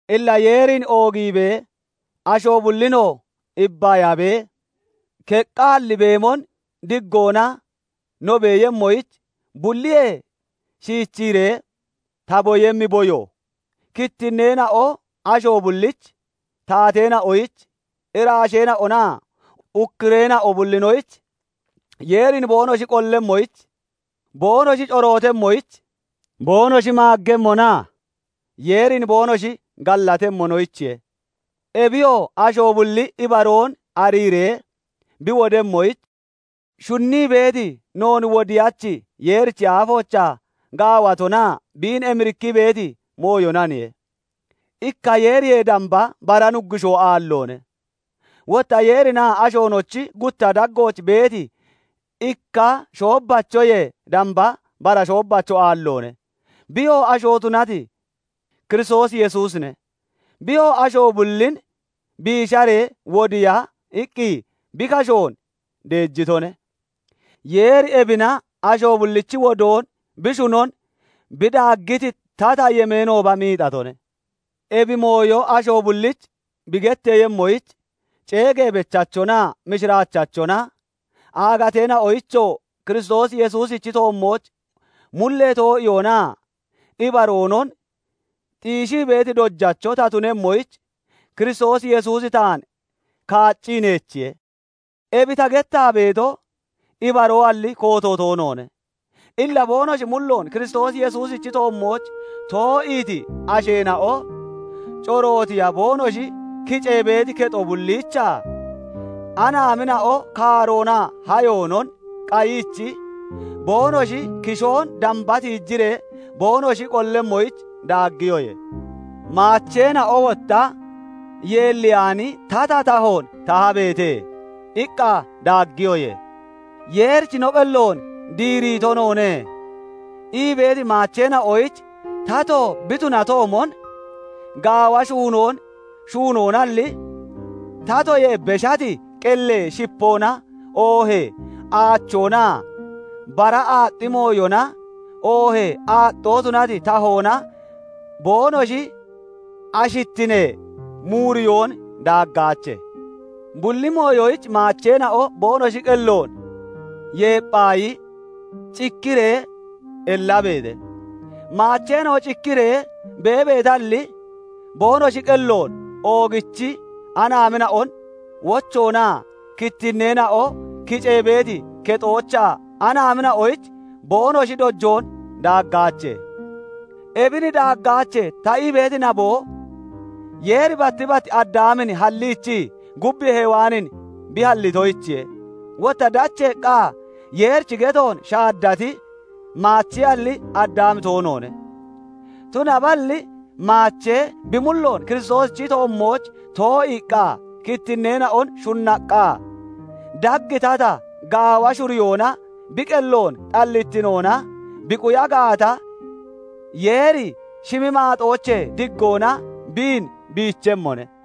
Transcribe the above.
Illa Yeerin oogiibee, asho bullinoo ibbayabee keqqaalli beemon diggoona no beeyemmoyich, bulliyee shiichiree ta boyemmi boyo, kittinneena'o asho bullich, taateena'oyich, iraasheena'onaa ukkureena'o bullinoyich Yeerin boonoshi qollemmoyich, boonoshi corootemmoyich, boonoshi maaggemmonaa Yeerin boonoshi gallatemmonoyichiye. Ebiyoo asho bulli ibaroon ariiree bi wodemmoyich shunnii beeti, noon Wodiyachi Yeerichi aafoochaa gaawatonaa biin emirikkii beeti mooyonaniye. Ikka Yeeriyee damba bara Nuggushoo aalloone; wotta Yeerinaa ashoonochi gutta daggooch beeti ikka shoobbachoyee damba bara shoobbacho aalloone; biyoo asho tunati Kiristoos Yesuusine. Biyoo asho bullin biisharee wodiiya iqqi bi kashoon deejitone; Yeeri ebina asho bullichi wodoon bi shunon bi daaggiti tata yemeenooba miixatone. Ebi mooyo asho bullich bi getteeyemmoyich, ceegee bechachonaa mishiraachachona, aagateena'oyichoo Kiristoos Yesuusichi toommooch mullee too'iyoonaa ibaroonon xiishii beeti dojacho ta tunemmoyich, Kiristoos Yesuusi taan kaaccii neechiye. Ebi ta gettaa beeto, ibaroalli kooto toonoone. Illa boonoshi mulloon Kiristoos Yesuusichi toommooch too'iiti asheena'o corootiya boonoshi kicee beeti kexo bulliichaa anaamina'o kaaroonaa hayoonon (naboonon) qayiichi, boonoshi kishoon damba tiijiree boonoshi qollemmoyich daaggiyoye. "Maacheena'o wotta yeelliyaani tata tahoon tahabeete" iqqa daaggiyoye. "Yeerich no qelloon diiriito noone" ii beeti maacheena'oyich tato bi tunatoomon gaawa shuunoon shuunoonalli, tatoyee beshati qellee shipoona oohee aachoonaa bara aaxxi mooyona, oohee aaxxoo tunati tahoona boonoshi ashittinee muureyoon daaggaache. Bulli mooyoyich maacheena'o boonoshi qelloon yeepphaayi cikkiree (udiree) ellabeete; maacheena'o cikkiree beebeetalli (udeetalli), boonoshi qelloon oogichii anaamina'on wochoonaa kittinneena'o kicee beeti kexoochaa anaamina'oyich boonoshi dojoonon daaggaache. "Ebin daaggaache" ta ii beeti naboo, Yeeri batti bat Addaamin halliichii, gub Hewaanin bi hallitoyichiye; wotta dacheeqqa Yeerichi getoon shaaddati, maachealli Addaami toonoone; tunaballi maachee bi mulloon Kiristoosichi toommooch too'iiqqa, kittinneena'on shunnaqqa, dag tata gaawa shuriyoona bi qelloon xallittinoona bi quya gaata, Yeeri shimi maaxoochee diggoona biin biichemmone.